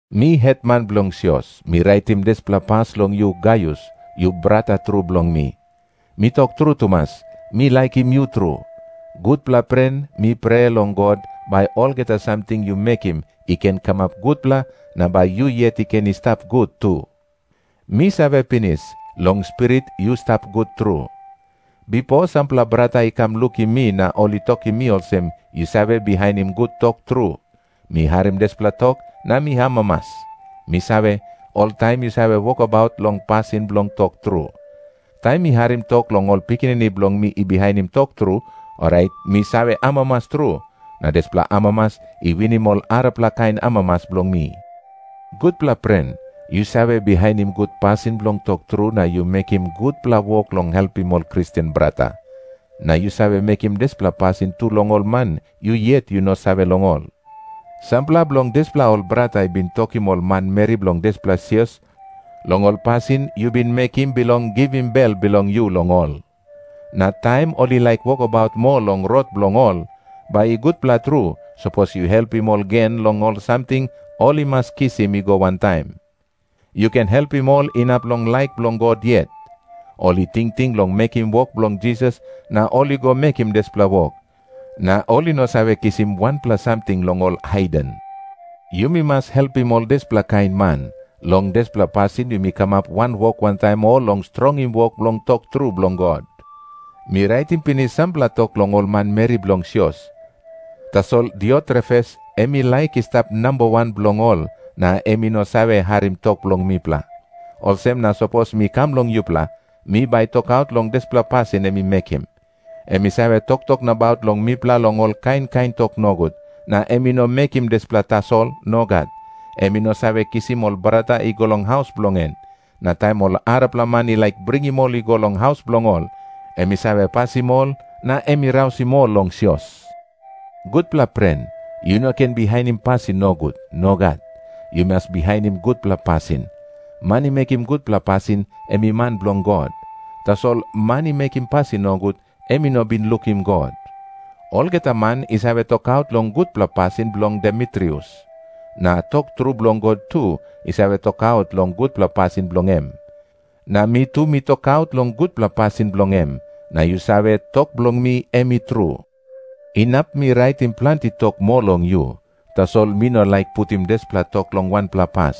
Mi hetman bilong sios, mi raitim dispela pas long yu, Gaius, yu brata tru bilong mi. Mi tok tru tumas, mi laikim yu tru. Gutpela pren, mi prea long God, bai olgeta samting yu mekim i ken kamap gutpela, na bai yu yet i ken i stap gut tu. Mi save pinis, long spirit yu stap gut tru. Bipo sampela brata i kam lukim mi, na ol i tokim mi olsem yu save bihainim gut tok tru. Mi harim dispela tok na mi amamas. Mi save, oltaim yu save wokabaut long pasin bilong tok tru. Taim mi harim tok long ol pikinini bilong mi i bihainim tok tru, orait mi save amamas tru, na dispela amamas i winim ol arapela kain amamas bilong mi. Gutpela pren, yu save bihainim gut pasin bilong tok tru na yu mekim gutpela wok bilong helpim ol Kristen brata. Na yu save mekim dispela pasin tu long ol man yu yet yu no save long ol. Sampela bilong dispela ol brata i bin tokim ol manmeri bilong dispela sios long ol pasin yu bin mekim bilong givim bel bilong yu long ol. Na taim ol i laik wokabaut moa long rot bilong ol, bai i gutpela tru sapos yu helpim ol gen long ol samting ol i mas kisim i go wantaim. Yu ken helpim ol inap long laik bilong God yet. Ol i tingting long mekim wok bilong Jisas na ol i go mekim dispela wok, na ol i no save kisim wanpela samting long ol haiden. Yumi mas helpim ol dispela kain man. Long dispela pasin yumi kamap wanwok wantaim ol long strongim wok bilong tok tru bilong God. Mi raitim pinis sampela tok long ol manmeri bilong sios. Tasol Diotrefes em i laik i stap namba wan bilong ol, na em i no save harim tok bilong mipela. Olsem na sapos mi kam long yupela, mi bai tokaut long dispela pasin em i mekim. Em i save toktok nabaut long mipela long ol kain kain tok nogut. Na em i no mekim dispela tasol. Nogat. Em i no save kisim ol brata i go long haus bilong en. Na taim ol arapela man i laik bringim ol i go long haus bilong ol, em i save pasim ol, na em i rausim ol long sios. Gutpela pren, yu no ken bihainim pasin nogut. Nogat. Yu mas bihainim gutpela pasin. Man i mekim gutpela pasin, em i man bilong God. Tasol man i mekim pasin nogut, em i no bin lukim God. Olgeta man i save tokaut long gutpela pasin bilong Demitrius. Na tok tru bilong God tu i save tokaut long gutpela pasin bilong em. Na mi tu mi tokaut long gutpela pasin bilong em, na yu save, tok bilong mi em i tru. Inap mi raitim planti tok moa long yu, tasol mi no laik putim dispela tok long wanpela pas.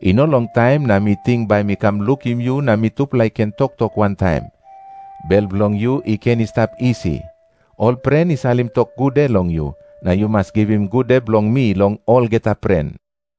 I no longtaim na mi ting mi bai kam lukim yu na mitupela i ken toktok wantaim. Bel bilong yu i ken i stap isi. Ol pren i salim tok gude long yu, na yu mas givim gude bilong mi long olgeta pren.